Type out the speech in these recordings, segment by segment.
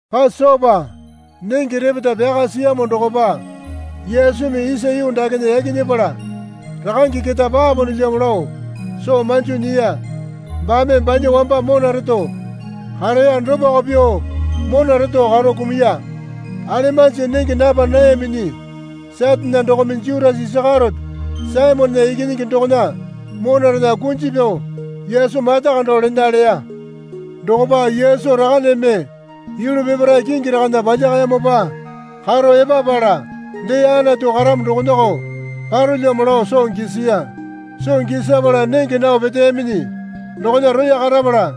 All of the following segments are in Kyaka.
Pasopa nenge repeta pyaka siyamo dokopa Yesumi isa yuu dakena yaki nyepala rakange keta paponolyamo lao soo manjo nyiya. Baame banya wamba mona reto kareya dopako pyuo mona reto karo kumuya. Alemanji nenge napa nayaminyi Satane dokome Jutasa Isakeriote Saimonena ikinyingi dokona monarena kunji pyao Yesu mata kando lena leya. Dokopa Yesu Rakaneme yulu peparae kingi rakana palyakayamopa karo epapala dee Anatu karamo dokonako parolyamo lao soo gisiya. Soo gisapala nenge nao peteyaminyi dokona roya karapala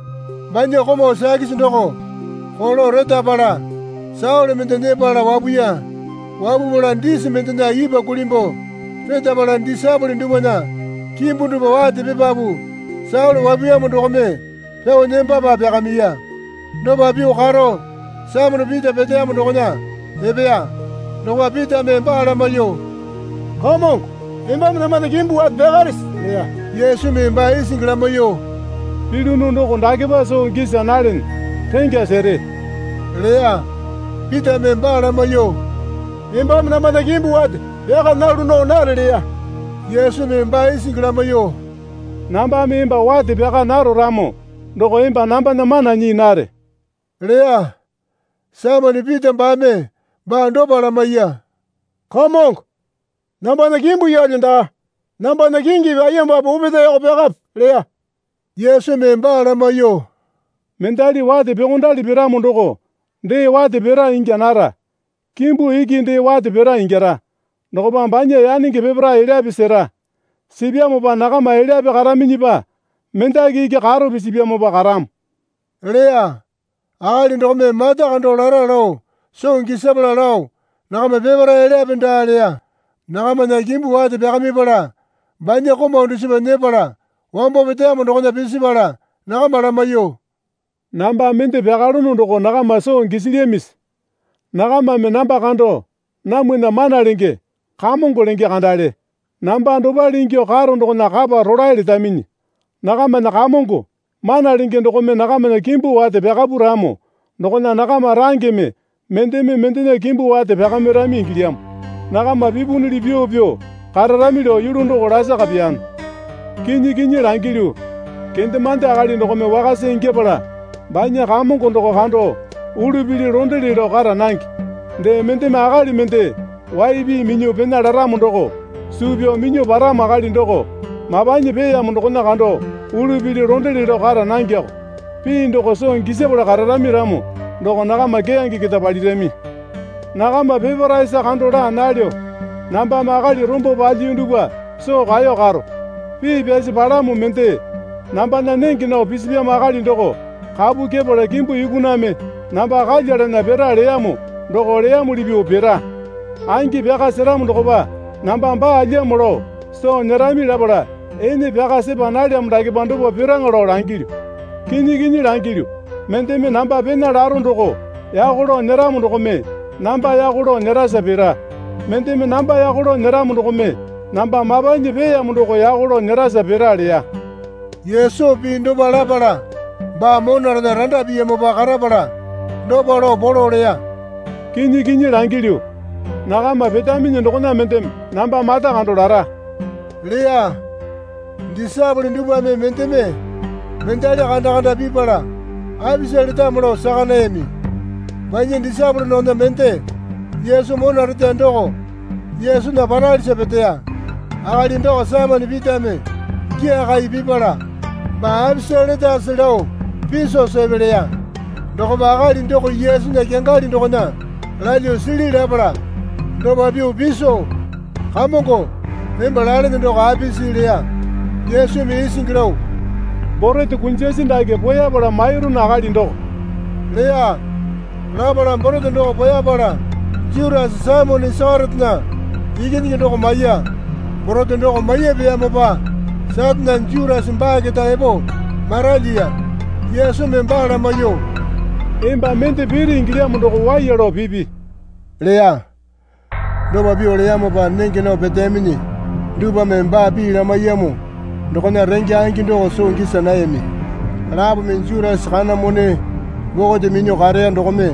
banya komau sakisi doko koko retapala saole mende nyepala wapuya. Wapupala disi mendena ipwa kulimbuo retapala disaepole dupwana kimbu dupwa wate pipapu saole wapuyamo dokome pyao nembapa pyakamiya. Dopa pyuo karo Saimone Pita peteyamo dokona epeya. Dokopa Pitame baa lamaiyuo, Kamongo, embame nambana kimbu wate pyakarese? leya. Yesumi baa isingi lamaiyuo, Pilyunu doko dakepa soo gisa nalene. Rengya sere leya. Pitame baa lamaiyuo, Embame nambana kimbu wate pyaka nalu nao nare leya. Yesumi baa isingi lamaiyuo, Nambame emba wate pyaka naro ramo doko emba nambana mana nyii nare leya. Saimone Pita baame baa dopa lamaiya. Kamongo, nambana kimbu yeelyo daa. Nambana kingipi ayembape opetaeko pyakape leya. Yesumi baa lamaiyuo, Mendali wate pyuokondali piramo doko dee wate pira ingya nara. Kimbu iki dee wate pira ingyara. Dokopa banya yanenge peparae elyape sera. Sipyamopa nakama elyape karaminyipa mendaki iki karo pisipyamopa karamo leya. (Akali dokome mata kando lara lao soo gisapala lao nakama peparae elyape daa leya.) Nakamana kimbu wate pyakamipala banya komau dusipa nyepala wambo peteyamo dokona pisipala nakama lamaiyuo, Namba mende pyakalono doko nakama soo gisilyamisi? Nakamame namba kando, Namwana Mana Lenge, Kamongo lenge kandale. Namba dopale ingyuo karo dokona kapa rolae letaminyi. Nakamana Kamongo, Mana Lenge dokome nakamana kimbu wate pyakapu ramo dokona nakama rangeme mendeme mendena kimbu wate pyakamirami ingilyamo. Nakama pipunyili pyuo pyuo kararami lao yulu doko lasaka pyano. Kinyi kinyi langilyu, kendemande akali dokome wakasa ingyapala banya kamongo doko kando ulu pili londele lao kara nange. Dee mendeme akali mende wai pii minyuo pena laramo doko suu pyao minyuo paramo akali doko mapanyi peeyamo dokona kando ulu pili londele lao kara nangeko. Pii doko soo gisapala kararami ramo doko nakama keyange keta palirami. Nakama peparaesa kando laa nalyo. Nambame akali rombo palyiyu dupwa soo kaeyo karo. Pii pyasi palamo mende, Nambana nenge nao pisipyamo akali doko kapu kyepala kimbu yukaname namba kalyalana pira leyamo doko leyamuli pyuo pira. Angi pyaka seramo dokopa namba baalyamo lao soo nyerami lapala ene pyaka sepa nalyamo dakepa dopa piraŋa lao langilyu. Kinyi kinyi langilyu, mendeme namba pena laro doko yako lao nyeramo dokome namba yako lao nyerasa pira. Mendeme namba yako lao nyeramo dokome namba mapanyi peeyamo doko yako lao nyerasa pira, leya. Yesu pii dopa lapala baa monarena randa piyamopa karapala dopa lao polo leya. Kinyi kinyi langilyu, nakama petaminyi dokona mendeme namba mata kando lara, leya. Disaepole dupwame mendeme mendali kanda kanda pipala apisa letamo lao saka nayami. Banya disaepole dokona mende Yesu mona reteya doko Yesunya paralisa peteya. Akali doko Saimone Pitame gyaakai pipala, Baa apisa letase lao piso sepe leya. Dokopa akali doko Yesunya kyangali dokona lalyuo sili lapala dopa pyuo piso, Kamongo, emba lalene doko apisi? leya. Yesumi isingi lao, Borete kunjasi dake poeyapala mairunu akali doko leya. Lapala borete doko poeyapala Jutasa Saimone Isakeriotena ikinyingi doko maiya. Borete doko maiyapeyamopa Satane Jutasa baa keta epo maralyiya. Yesumi baa lamaiyuo, Emba mende piri ingilyamo doko waiya lao pipi leya. Dopa pyuo leyamopa nenge nao peteyaminyi dupwame baa pii lamaiyamo dokona renge angi doko soo gisa nayami. Lapome Jutasa kana mone bokote minyuo kareya dokome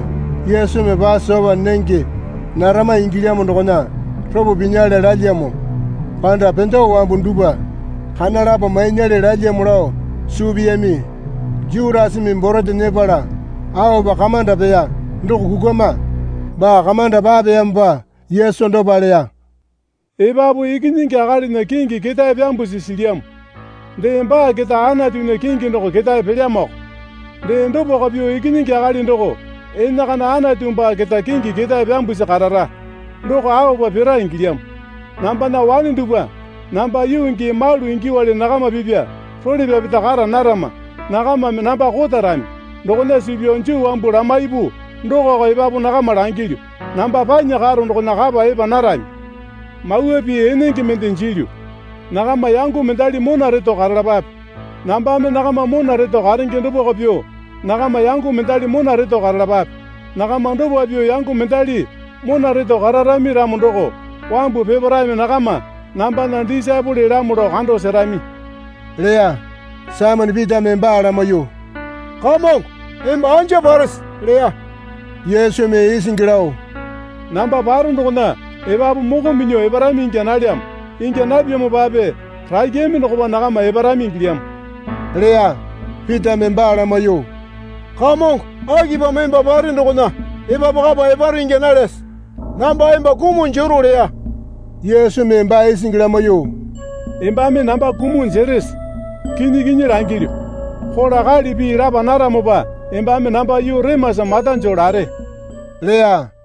Yesumi Pasopa nenge narama ingilyamo dokona ropo pinyale lalyamo panda pendewa wambu dupwa kana lapo mainyale lalyamo lao suu piyami. Jutasame borete nyepala aopa kamanda peya doko kukwama. Baa kamanda papeyamopa Yesu dopa leya. Epapu Ikinyingi Akalinya kingi ketae pyambusi silyamo. Dee baa keta Anatunya kingi doko ketae pelyamoko. Dee dopako pyuo Ikinyingi Akali doko enakana Anatu baa keta kingi ketae pyambusi karara. Doko aopa pira ingilyamo. Nambana wane dupwa namba yuu gii malu ingyuowale nakama pipya role pyapeta kara narama. Nakamame namba kotarami. Dokona suu pyao Juu wambu lamaipu dokoko epapu nakama langilyu, Namba panya karo dokona kapa epa narami. Mawa pii enenge mende jilyu. Nakama yango mendali mona reto karalapape. Nambame nakama mona reto karenge dopako pyuo nakama yango mendali mona reto karalapape. Nakama dopa pyuo yango mendali mona reto kararami ramo doko wambu peparaeme nakama nambana disaepolelamo lao kando serami leya. Saimone Pitame baa lamaiyuo, Kamongo, emba anja parese? leya. Yesumi isingi lao, Namba paro dokona epapu moko minyuo eparami ingya nalyamo. Ingya napyamopape rakyame dokopa nakama eparami ingilyamo leya. Pitame baa lamaiyuo, Kamongo akipamo emba pare dokona epapu kapa eparo ingya nalyase? Namba emba kumuo jero leya. Yesumi baa isingi lamaiyuo, Embame namba kumuo jerese? Kinyi kinyi langilyu, kola kali pii lapa naramopa embame namba yuu remasa mata joo lare leya.